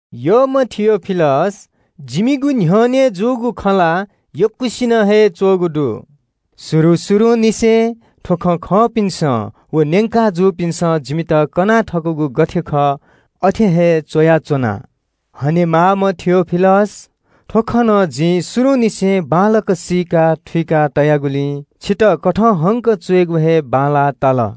यःम्ह थियोफिलस, जिमिगु न्ह्यःने जूगु खँ ला यक्वसिनं हे च्वःगु दु। शुरु शुरुंनिसें थ्व खँ खंपिन्सं व न्यंका जूपिन्सं जिमित कना थकूगु गथे खः अथे हे च्वयाच्वना। हनेमाःम्ह थियोफिलस, थ्व खँ नं जिं शुरुंनिसें बांलाक सीका थुइका तयागुलिं छितः कथंहंक च्वयेगु हे बांलाः ताल।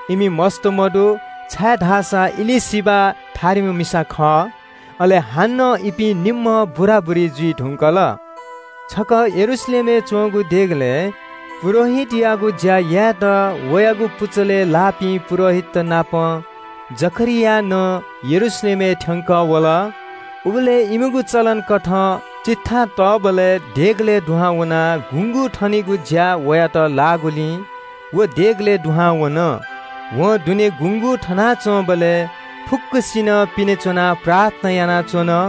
इमि मस्त मदु, छाय्धाःसा एलीशिबा थारिम्ह मिसा खः। अले हानं इपिं निम्हं बुराबुरी जुइ धुंकल। छकः यरूशलेमय् च्वंगु देगलय् पुजाहारीयागु ज्या यायेत वयागु पुचलय् लाःपिं पुजाहारीतनापं जकरिया नं यरूशलेमय् थ्यंकः वल। उबलय् इमिगु चलन कथं चिट्ठा तःबलय् देगलय् दुहां वनाः गुँगू थनेगु ज्या वयात लाःगुलिं व देगलय् दुहां वन। वं दुने गुँगू थनाच्वंबलय् फुक्क मनूतय्सं पिने च्वनाः प्रार्थना यानाच्वन।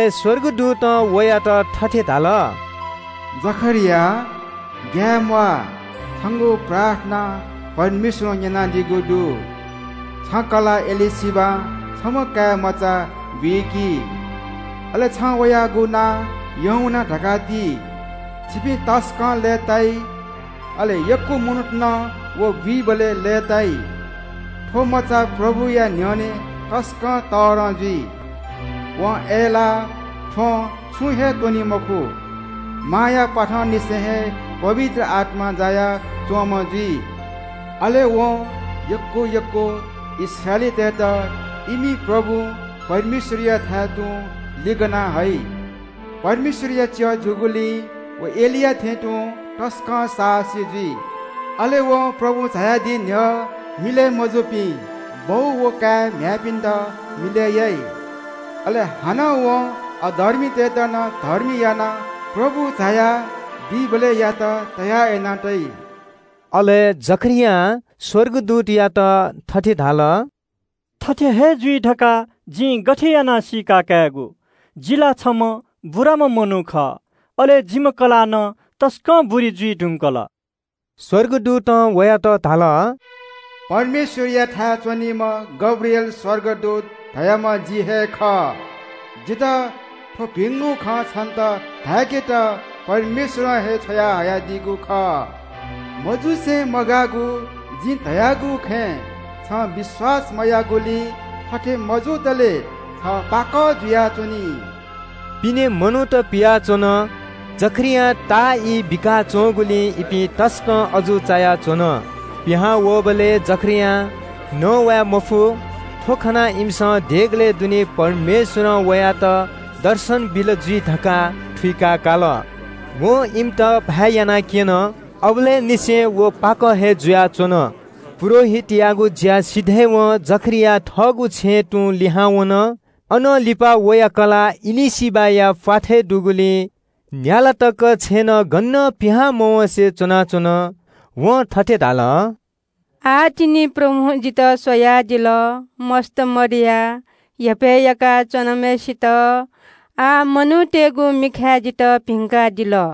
स्वर्गदूतं वयात थथे धाल – “जकरिया, ग्याये म्वाः, छंगु प्रार्थना परमेश्वरं न्यनादीगु दु। छं कलाः एलीशिबां छम्ह काय्मचा बुइकी, अले छं वयागु नां यूहन्ना धकाः ति। छिपिं तसकं लय्ताइ। अले यक्व मनूत नं व बुइबलय् लय्ताइ। थ्व मचा परमप्रभुया न्ह्यःने तसकं तःधं जुइ। वं अय्लाः थ्वँ छुं हे त्वनी मखु। मांया प्वाथंनिसें हे पवित्र आत्मां जायाच्वंम्ह जुइ। अले वं यक्व यक्व इस्राएलीतय्त इमि परमप्रभु परमेश्वरयाथाय् तुं लिगना हइ। परमेश्वरया च्यः जूगुलिं व एलिया थें तुं तसकं साहसी जुइ। अले वं प्रभु झायादी न्ह्यः मिलय् मजूपिं बौ व काय् म्ह्याय्पिन्त मिलय् याइ। अले हानं वं अधर्मीतय्त नं धर्मी यानाः प्रभु झाया दीबलय्यात तयार याना तइ।” अले जकरियां स्वर्गदूतयात थथे धाल – “थथे हे जुइ धकाः जिं गथे यानाः सीका कायेगु? जि ला छम्ह बुराम्ह मनू खः, अले जिम्ह कलाः नं तसकं बुरी जुइ धुंकल।” स्वर्गदूतं वयात धाल – “परमेश्वरयाथाय् च्वनीम्ह गब्रिएल स्वर्गदूत धाःम्ह जि हे खः। जितः थ्व भिंगु खँ छन्त धाय्केत परमेश्वरं हे छ्वयाहयादीगु खः। मजुसे मगाःगु जिं धयागु खँय् छं विश्वास मयाःगुलिं थथे मजुतले छ पाकः जुयाच्वनी।” पिने मनूत पियाच्वन। जकरियां ताःई बिकाच्वंगुलिं इपिं तसकं अजू चायाच्वन। पिहां वःबलय् जकरियां नवाय् मफु। थ्व खनाः इमिसं देगलय् दुने परमेश्वरं वयात दर्शन बिल जुइ धकाः थुइकाकाल। वं इमित ल्हाःभाय् यानाक्यन। अबलय् निसें व पाकः हे जुयाच्वन। पुजाहारीयागु ज्या सिधय्वं जकरिया थःगु छेँय् तुं लिहां वन। अनं लिपा वया कलाः एलीशिबाया प्वाथय् दुगुलिं न्याला तक छेँनं गनं पिहां मवँसें च्वनाच्वन। वं थथे धाल – “आः तिनि प्रभुं जितः स्वयादिल। मस्त मदयाः हेपय् याका च्वनाम्हय्सित आः मनूतय्गु मिखाय् जितः भिंकादिल।”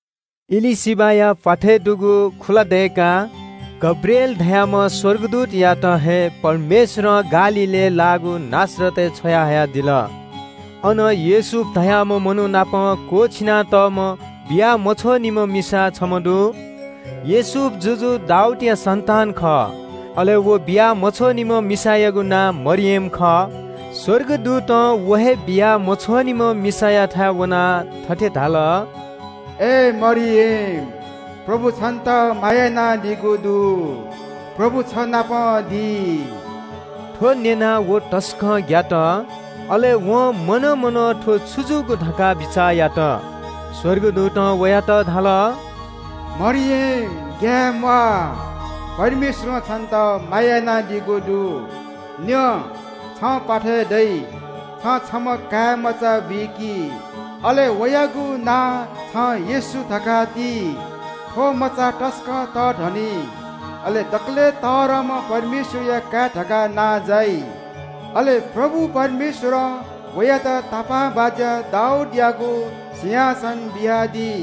एलीशिबाया प्वाथय् दुगु खुला दय्काः गब्रिएल धाःम्ह स्वर्गदूतयात हे परमेश्वरं गालीलय् लाःगु नासरत शहरय् छ्वयाहयादिल। अन योसेफ धाःम्ह मनू नाप क्वःछिना तःम्ह बिया मछ्वःनिम्ह मिसा छम्ह दु। योसेफ जुजु दाऊदया सन्तान खः। अले व बिया मछ्वःनिम्ह मिसायागु नां मरियम खः। स्वर्गदूतं व हे बिया मछ्वःनिम्ह मिसायाथाय् वनाः थथे धाल – “अय् मरियम, परमप्रभुं छन्त दया माया यानादीगु दु। परमप्रभु छ नाप दी।” थ्व न्यनाः व तसकं ग्यात। अले वं मनं मनं थ्व छु जूगु धकाः बिचाः यात। स्वर्गदूतं वयात धाल – “मरियम ग्याये म्वाः, परमेश्वरं छन्त माया यानादीगु दु। न्यँ, छं प्वाथय् दइ। छं छम्ह काय्मचा बुइकी। अले वयागु नां छं येशू धकाः ति। थ्व मचा तसकं तःधनी, अले दकलय् तःधंम्ह परमेश्वरया काय् धकाः नां जाइ। अले परमप्रभु परमेश्वरं वयात वया तापाःबाज्या दाऊदयागु सिंहासन बियादी।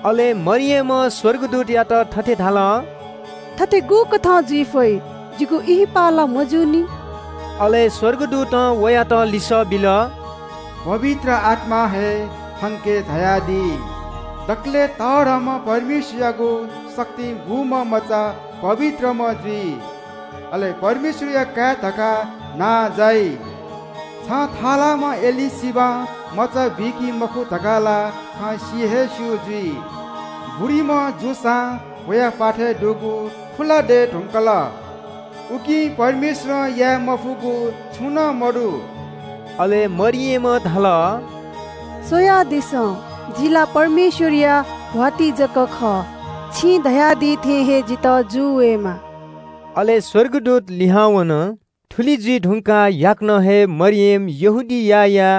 अले मरियमं स्वर्गदूतयात थथे धाल – “थथे गुकथं जुइ फइ? जिगु ब्याहा ला मजूनि।” अले स्वर्गदूतं वयात लिसः बिल – “पवित्र आत्मा हे छंके झायादी। दकलय् तःधंम्ह परमेश्वरयागु शक्तिं बूम्ह मचा पवित्रम्ह जुइ, अले परमेश्वरया काय् धकाः नां जाइ। छं थःलाःम्ह एलीशिबां मचा बुइकी मखु धकाः ला छं सि हे स्यू जुइ। बुरीम्ह जूसां वया प्वाथय् दुगु खुला दये धुंकल। उकिं परमेश्वरं याये मफुगु छुं नं मदु।” अले मरियमं धाल – “स्वयादिसँ, जि ला परमेश्वरया भ्वातिं जक खः। छिं धयादी थें हे जितः जू वयेमा।” अले स्वर्गदूत लिहां वन। थुलि जुइ धुंकाः याकनं हे मरियम यहूदियाया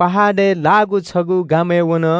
पहाडय् लाःगु छगू गामय् वन।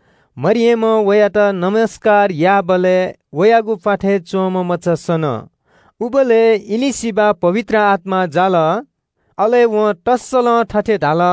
मरियमं वयात ज्वजलपा याःबलय् वयागु प्वाथय् च्वंम्ह मचा सन। उबलय् एलीशिबा पवित्र आत्मां जाल। अले वं तःसलं थथे धाल –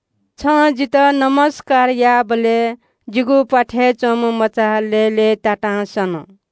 छं जितः ज्वजलपा याःबलय् जिगु प्वाथय् च्वंम्ह मचा लय्लय्तातां सन।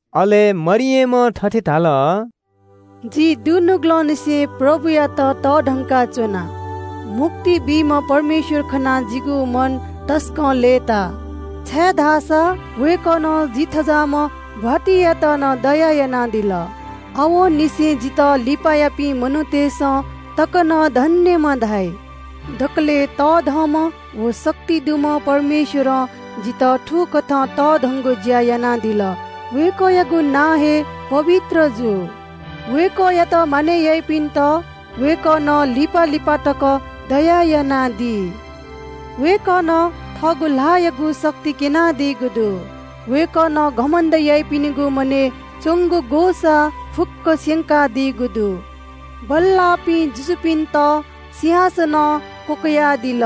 अले मरियमं थथे धाल – “जिं दुनुगलंनिसें परमप्रभुयात तःधंकाच्वना। मुक्ति बीम्ह परमेश्वर खनाः जिगु मन तसकं लय्ताः, छाय्धाःसा वय्कलं जि थज्याःम्ह भ्वातिंयात नं दया यानादिल। आवंनिसें जितः फुक्क मनूतय्सं तक नं धन्यम्ह धाइ। दकलय् तःधंम्ह व शक्ति दुम्ह परमेश्वरं जितः थुकथं तःधंगु ज्या यानादिल। वय्कःयागु नां हे पवित्र जू। वय्कःयात मानय् याइपिन्त वय्कलं पुस्ता पुस्तां तकं दया यानादी। वय्कलं थःगु ल्हाःयागु शक्ति क्यनादीगु दु। वय्कलं घमण्ड याइपिनिगु मनय् च्वंगु ग्वसाः फुक्कं स्यंकादीगु दु। वय्कलं बल्लाःपिं जुजुपिन्त सिंहासनं क्वकयादिल,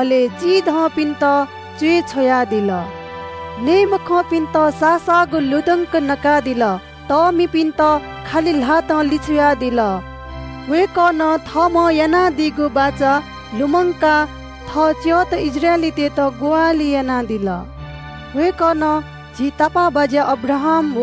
अले चिधंपिन्त च्वय् छ्वयादिल। वय्कलं नये मखंपिन्त साःसाःगु लुधंक नकादिल। तःमिपिन्त खालि ल्हातं लिछ्वयादिल। वय्कलं थःम्हं यानादीगु बाचा लुमंकाः थः च्यःत इस्राएलीतय्त ग्वाहालि यानादिल। वय्कलं झी तापाःबाज्या अब्राहाम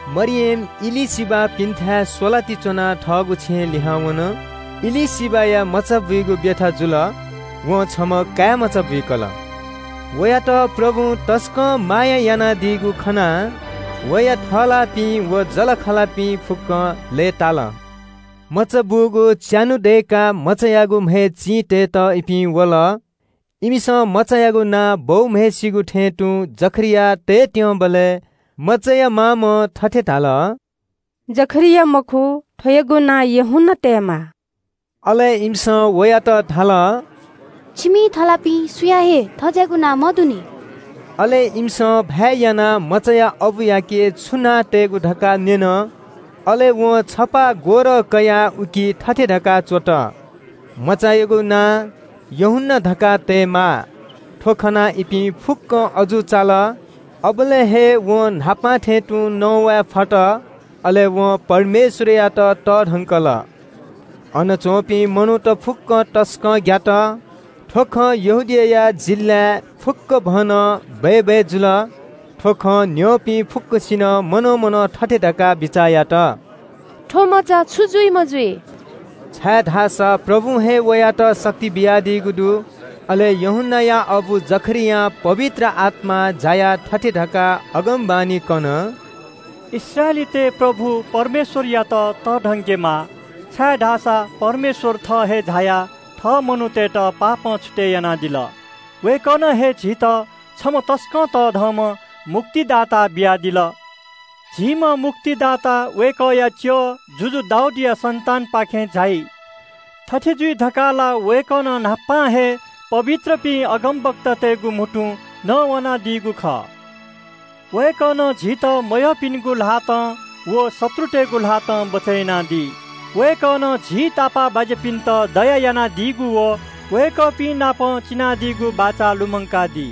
मरियम एलीशिबापिन्थाय् स्वलाति च्वनाः थःगु छेँय् लिहां वन। एलीशिबाया मचाबुइगु ब्यथा जुल। वं छम्ह काय्मचा बुइकल। वयात परमप्रभुं तसकं माया यानादीगु खनाः वया थःलाःपिं व जःलाखःलापिं फुक्कं लय्ताल। मचा बूगु च्यान्हु दय्काः मचायागु म्हय् चिं तयेत इपिं वल। इमिसं मचायागु नां बौम्हय्सिगु थें तुं जकरिया तयेत्यंबलय् मचाया मामं थथे धाल – “जकरिया मखु, थ्वयागु नां यूहन्ना तयेमाः।” अले इमिसं वयात धाल – “छिमि थःलाःपिं सुयां हे थज्याःगु नां मदुनि।” अले इमिसं ल्हाःभाय् यानाः मचाया अबुयाके छु नां तयेगु धकाः न्यन। अले वं छपाः ग्वरः कयाः उकी थथे धकाः च्वत – “मचायागु नां यूहन्ना धकाः तयेमाः।” थ्व खनाः इपिं फुक्कं अजू चाल। अबलय् हे वं न्हापा थें तुं नवाये फत। अले वं परमेश्वरयात तःधंकल। अन च्वंपिं मनूत फुक्कं तसकं ग्यात। थ्व खँ यहूदिया जिल्लाय् फुक्कभनं बय्बय् जुल। थ्व खँ न्यंपिं फुक्कसिनं मनं मनं थथे धकाः बिचाः यात – “थ्व मचा छु जुइम्ह जुइ?” छाय्धाःसा परमप्रभुं हे वयात शक्ति बियादीगु दु। अले यूहन्नाया अबु जकरियां पवित्र आत्मां जायाः थथे धकाः अगमवाणी कन – “इस्राएलीतय् परमप्रभु परमेश्वरयात तःधंकेमा, छाय्धाःसा परमेश्वर थः हे झायाः थः मनूतय्त पापं छुतय् यानादिल। वय्कलं हे झीत छम्ह तसकं तःधंम्ह मुक्तिदाता बियादिल। झीम्ह मुक्तिदाता वय्कःया च्यः जुजु दाऊदया सन्तानपाखें झाइ। थथे जुइ धकाः ला वय्कलं न्हापा हे पवित्रपिं अगमवक्तातय्गु म्हुतुं न्ववानादीगु खः। वय्कलं झीत मयःपिनिगु ल्हातं व शत्रुतय्गु ल्हातं बचय् यानादी। वय्कलं झी तापाःबाज्यापिन्त दया यानादीगु व वय्कःपिं नाप चिनादीगु बाचा लुमंकादी।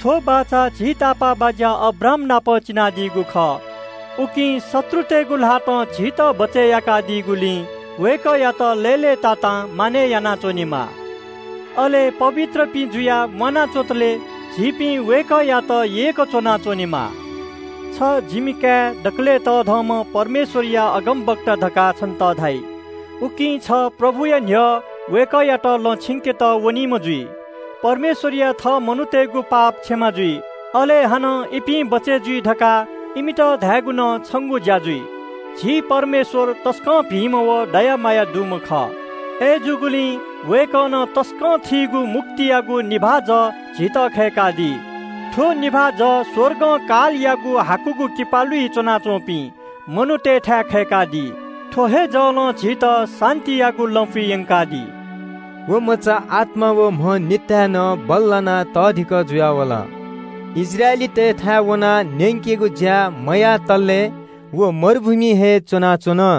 थ्व बाचा झी तापाःबाज्या अब्राहामनाप चिनादीगु खः। उकिं शत्रुतय्गु ल्हातं झीत बचय् याका दीगुलिं वय्कःयात लय्लय्तातां मानय् यानाच्वनेमा। अले पवित्रपिं जुयाः म्वाना च्वंतले मग्यासे झीपिं वय्कःयात यय्क च्वनाच्वनेमा। छ नं, जिमि काय्, दकलय् तःधंम्ह परमेश्वरया अगमवक्ता धकाः छन्त धाइ। उकिं छ प्रभुया न्ह्यः वय्कःयात लँ छिंकेत वनीम्ह जुइ। परमेश्वरया थःमनूतय्गु पाप क्षमा जुइ, अले हानं इपिं बचय् जुइ धकाः इमित धायेगु नं छंगु ज्या जुइ। झी परमेश्वर तसकं भिंम्ह व दया माया दुम्ह खः। अय्जूगुलिं वय्कलं तसकं थीगु मुक्तियागु निभाः जः झीत खय्कादी। थ्व निभाः जः स्वर्गं कालयागु हाकुगु किपालुइ च्वनाच्वंपिं मनूतय्थाय् खय्कादी। थ्व हे जलं झीत शान्तियागु लँपुइ यंकादी।” व मचा आत्मा व म्ह निताय् नं बल्लानाः तःधिकः जुयावल। इस्राएलीतय्थाय् वनाः न्यंकेगु ज्या मयातले व मरुभूमिइ हे च्वनाच्वन।